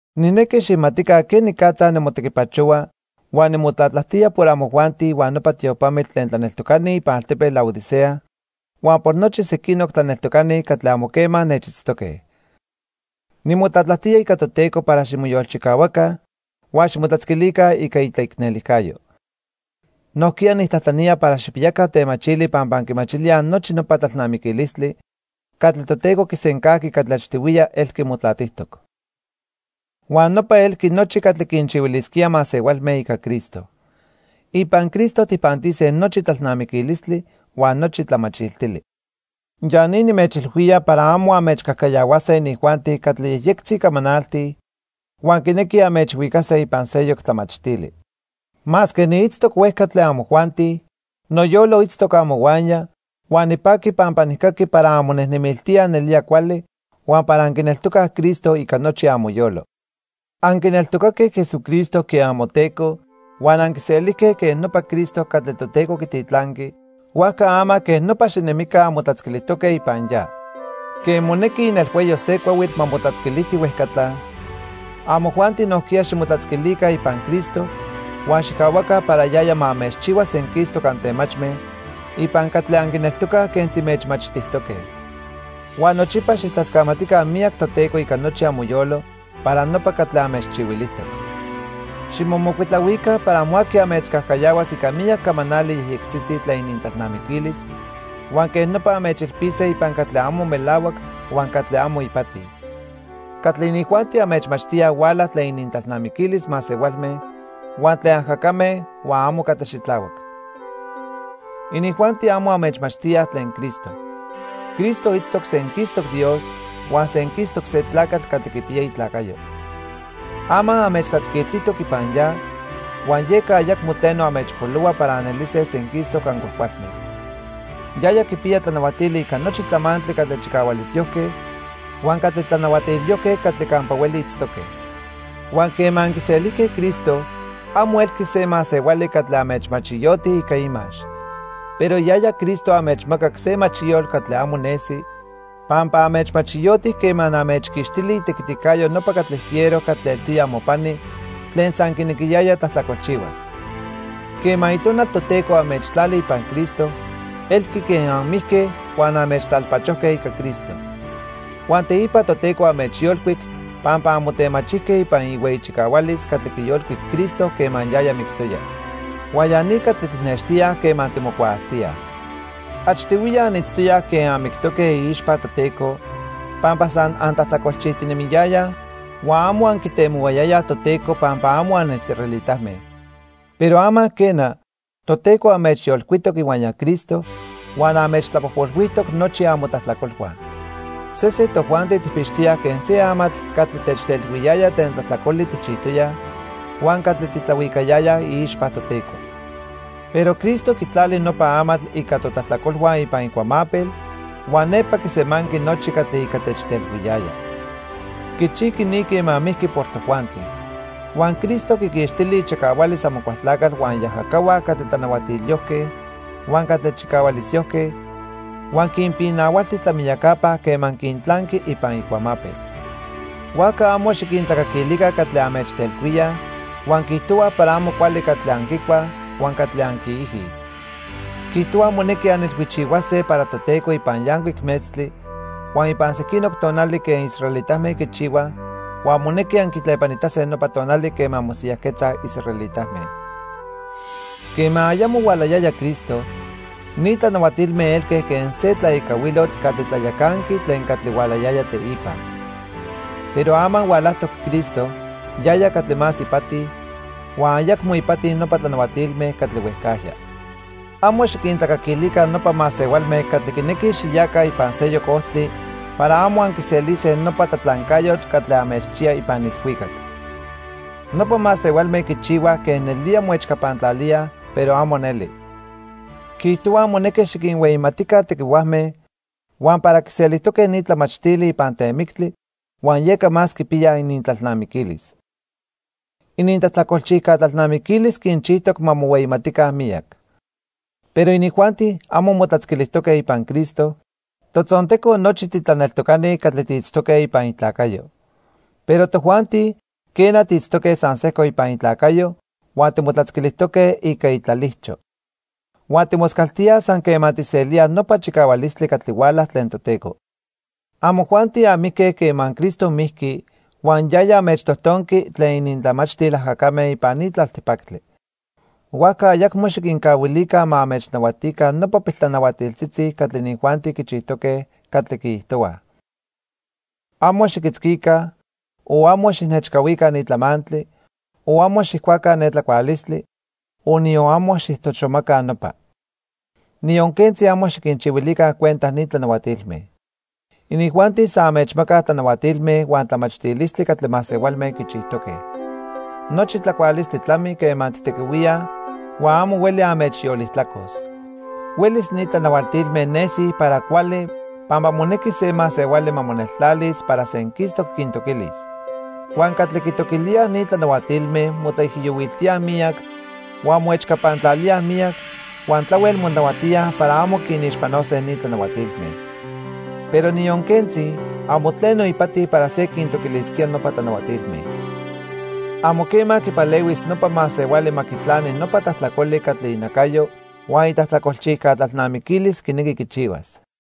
Nijnequi xijmatica quenicatza nimotequipachohua huan nimotlatlajtía por amojuanti huan nopa tiopamitl tlen tlaneltocani ipan altepetl Laodicea huan por nochi sequinoc tlaneltocani catli amo quema nechitztoque. Nimotlatlajtía ica Toteco para ximoyolchicahuaca huan ximotlatzquilica ica itlaicnelijcayo. Nojquiya nijtlajtlanía para xijpiyaca temachili pampa anquimachilíaj nochi nopa tlalnamiquilistli catli Toteco quisencajqui catli achtihuiya elqui motlatijtoc. Huan nopa elqui nochi catli quinchihuilisquía masehualme ica Cristo. Ipan Cristo tijpantise nochi tlalnamiquilistli huan nochi tlamachiltili. Ya ni nimechilhuía para amo anmechcajcayahuase inijuanti catli yejyectzi camanaltij huan quinequij anmechhuicase ipan seyoc tlamachtili. Masque niitztoc huejca tlen amojuanti, noyolo itztoc amohuaya huan nipaqui pampa nijcaqui para anmonejnemiltíaj nelía cuali huan para anquineltocaj Cristo ica nochi amoyolo. Anquineltocaque Jesucristo quen amoTeco huan anquiselijque quen nopa Cristo catli Toteco quititlanqui, huajca ama quej nopa xinemica anmotlatzquilijtoque ipan ya. Quen monequi inelhuayo se cuahuitl ma motlatzquilijti huejcatla, amojuanti nojquiya ximotlatzquilica ipan Cristo huan xijcahuaca para yaya ma anmechchihua senquistoc antemachme ipan catli anquineltocaj quen timechmachtijtoque. Huan nochipa xijtlascamatica miyac Toteco ica nochi amoyolo para nopa catli anmechchihuilijtoc. Ximomocuitlahuica para amo aqui anmechcajcayahuas ica miyac camanali yejyectzitzi tlen inintlalnamiquilis huan quej nopa anmechilpise ipan catli amo melahuac huan catli amo ipati. Catli inijuanti anmechmachtíaj huala tlen inintlalnamiquilis masehualme huan tlen ajacame huan amo catli xitlahuac. Inijuanti amo anmechmachtíaj tlen Cristo. Cristo itztoc senquistoc Dios huan senquistoc se tlacatl catli quipiya itlacayo. Ama anmechtlatzquiltijtoc ipan ya, huan yeca ayacmo tleno anmechpolohua para anelise senquistoc ancuajcualme. Yaya quipiya tlanahuatili ica nochi tlamantli catli chicahualisyojque huan catli tlanahuatilyojque catli campa hueli itztoque. Huan quema anquiselijque Cristo, amo elqui se masehuali catli anmechmachiyoti ica imax. Pero yaya Cristo anmechmacac se machiyotl catli amo nesi, pampa anmechmachiyoti quema anmechquixtili itequiticayo nopa catli fiero catli eltoya amopani tlen san quinequiyaya tlajtlacolchihuas. Quema Itonal Toteco anmechtlali ipan Cristo, elqui quen anmijque huan anmechtlalpachojque ica Cristo. Huan teipa Toteco anmechyolcuic pampa anmotemachijque ipan ihueyi chicahualis catli quiyolcuic Cristo quema yaya mictoya. Huan ya ni catli tijnextíaj quema timocuaaltíaj. Achtihuiya anitztoyaj quen anmictoque iixpa Toteco pampa san antlajtlacolchijtinemiyayaj huan amo anquitemohuayayaj Toteco pampa amo anisraelitame. Pero ama quena, Toteco anmechyolcuitoc ihuaya Cristo huan anmechtlapojpolhuijtoc nochi amotlajtlacolhua. Sesen tojuanti tijpixtoyaj quen se amatl catli techtelhuiyaya tlen tlajtlacoli tijchijtoyaj huan catli titlahuicayaya iixpa Toteco. Pero Cristo quitlali nopa amatl ica totlajtlacolhua ipan icuamapel huan nepa quisemanqui nochi catli ica techtelhuiyaya. Quichijqui ni quema mijqui por tojuanti. Huan Cristo quiquixtili ichicahualis Amocualtlacatl huan iajacahua catli tlanahuatilyojque huan catli chicahualisyojque huan quinpinahualti tlamiyacapa quema quintlanqui ipan icuamapel. Huajca amo xiquintlacaquilica catli anmechtelhuíaj huan quiijtohuaj para amo cuali catli anquicuaj huan catli anquiijij. Quiijtohuaj monequi anilhuichihuase para Toteco ipan yancuic metztli huan ipan sequinoc tonali quen israelitame quichihuaj huan monequi anquitlepanitase nopa tonali quema mosiyajquetzaj israelitame. Quema ayamo hualayaya Cristo, ni tlanahuatilme elque quen se tlaecahuilotl catli tlayacanqui tlen catli hualayaya teipa. Pero ama hualajtoc Cristo yaya catli más ipati, huan ayacmo ipati nopa tlanahuatilme catli huejcajya. Amo xiquintlacaquilica nopa masehualme catli quinequij xiyaca ipan seyoc ojtli para amo anquiselise nopa tlatlancayotl catli anmechchiya ipan ilhuicac. Nopa masehualme quichihuaj quen nelía moechcapantlalíaj, pero amo neli. Quiijtohuaj monequi xiquinhueyimatica tequihuajme huan para quiselijtoque ni tlamachtili ipan temictli huan yeca más quipiyaj inintlalnamiquilis. Inintlajtlacolchijca tlalnamiquilis quinchijtoc ma mohueyimatica miyac. Pero inijuanti amo motlatzquilijtoque ipan Cristo, totzonteco nochi titlaneltocani catli tiitztoque ipan itlacayo. Pero tojuanti, quena, tiitztoque san sejco ipan itlacayo huan timotlatzquilijtoque ica itlalijcho. Huan timoscaltíaj san quema tijselíaj nopa chicahualistli catli huala tlen Toteco. Amojuanti anmijque quema Cristo mijqui, huan yaya anmechtojtonqui tlen inintlamachtil ajacame ipan ni tlaltipactli. Huajca ayacmo xiquincahuilica ma anmechnahuatica nopa piltlanahuatiltzitzi catli inijuanti quichijtoque, catli quiijtohuaj: "Amo xiquitzquica o amo xijnechcahuica ni tlamantli, o amo xijcuaca ne tlacualistli, o niyon amo xijtoxomaca nopa." Niyon quentzi amo xiquinchihuilica cuenta ni tlanahuatilme. Inijuanti san anmechmacaj tlanahuatilme huan tlamachtilistli catli masehualme quichijtoque. Nochi tlacualistli tlami quema tijtequihuíaj huan amo hueli anmechyolijtlacos. Huelis ni tlanahuatilme nesij para cuali pampa monequi se masehuali ma moneltlalis para senquistoc quintoquilis. Huan catli quitoquilíaj ni tlanahuatilme motlaijiyohuiltíaj miyac, huan moechcapantlalíaj miyac, huan tlahuel monahuatíaj para amo quinixpanose ni tlanahuatilme. Pero niyon quentzi, amo tleno ipati para se quintoquilisquía nopa tlanahuatilme. Amo quema quipalehuis nopa masehuali ma quitlani nopa tlajtlacoli catli inacayo huan itlajtlacolchijca tlalnamiquilis quinequi quichihuas.